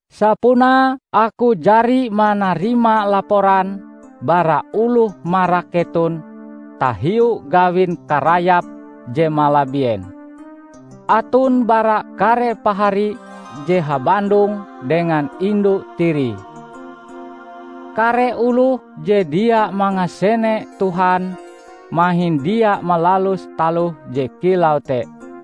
Sapunae aku jari manarima laporan bara oloh marak keton tahiu gawin karayap je malabien; Aton bara kare pahari je habandong dengan indu tirie. Kare oloh je dia mangasene Tuhan mahin dia malalus taloh je kilau te!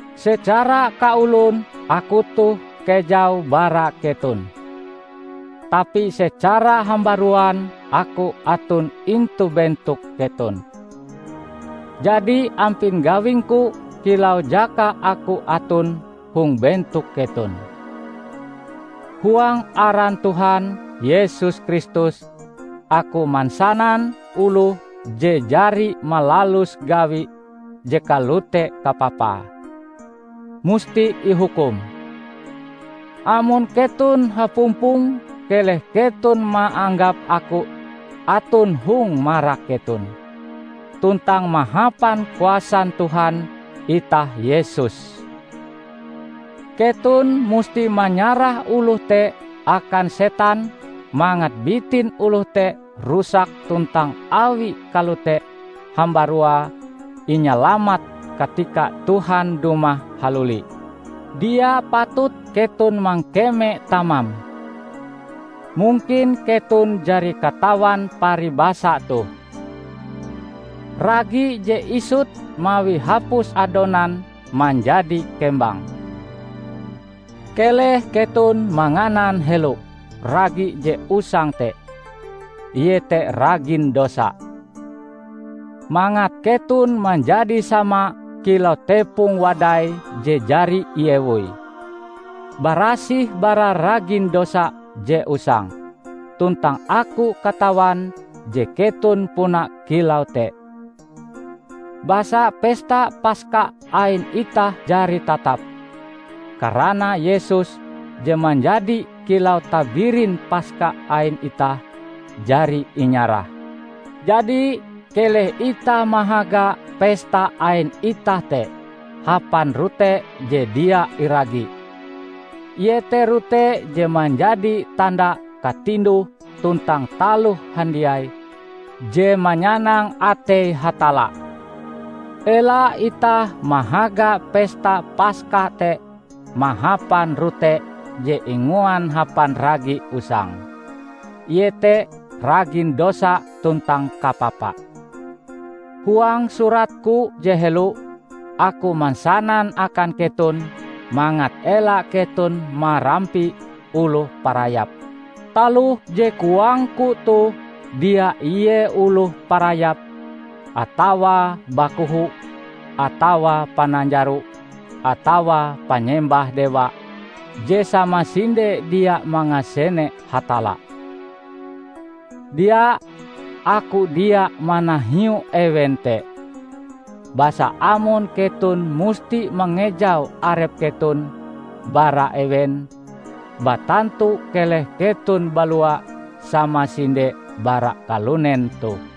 Secara kaolon aku toh kejau bara keton, tapi secara hambaruan aku aton intu bentok keton. Jadi ampin gawingku kilau jaka aku aton hong bentok keton, "Huang aran Tuhan Yesus Kristus aku mansanan oloh je jari malalus gawi je kalote kapapae, musti ihukum!" Amon keton hapumpong keleh keton maanggap aku aton hong marak keton, tuntang mahapan kuasan Tuhan itah Yesus, keton musti manyarah oloh te akan setan mangat bitin oloh te rusak tuntang awi kalote hambaruae inyalamat katika Tuhan dumah haluli. Dia patut keton mangkeme tamam. Mungkin keton jari katawan paribasa toh, "Ragi je isut mawi hapus adonan manjadi kembang!" Keleh keton manganan helo ragi je usang te, iete ragin dosa, mangat keton manjadi sama kilau tepong wadai je jari iewoi, barasih bara ragin dosa je usang, tuntang aku katawan je keton puna kilau te. Basa pesta Paska ain itah jari tatap, karana Yesus je manjadi kilau tabirin Paska ain itah, jari inyarah. Jadi, keleh itah mahaga pesta ain itah te hapan rote je dia iragi, iete rote je manjadi tanda katinduh tuntang taloh handiai je manyanang atei Hatalla. Ela itah mahaga pesta Paska te mahapan rote je inguan hapan ragi usang, iete ragin dosa tuntang kapapa. Huang suratku je helo, aku mansanan akan keton mangat ela keton marampi oloh parayap. Taloh je koangku toh dia ie oloh parayap atawa bakoho atawa pananjaro atawa panyembah dewa je samasinde dia mangasene Hatalla. Dia! Aku dia manahiu ewen te; basa amon keton musti mangejau arep keton bara ewen, batantu keleh keton balua samasinde bara kalunen toh.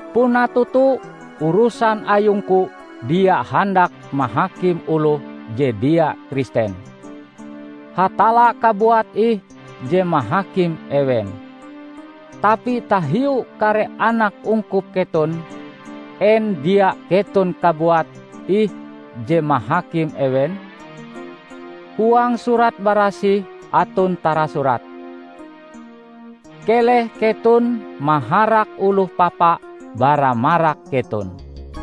Puna toto, urusan ayungku dia handak mahakim oloh je dia Kristen. Hatalla kabuat ih je mahakim ewen. Tapi tahiu kare anak ungkup keton, en dia keton kabuat ih je mahakim ewen? Huang Surat Barasih aton tarasurat, "Keleh keton maharak oloh papa bara marak keton."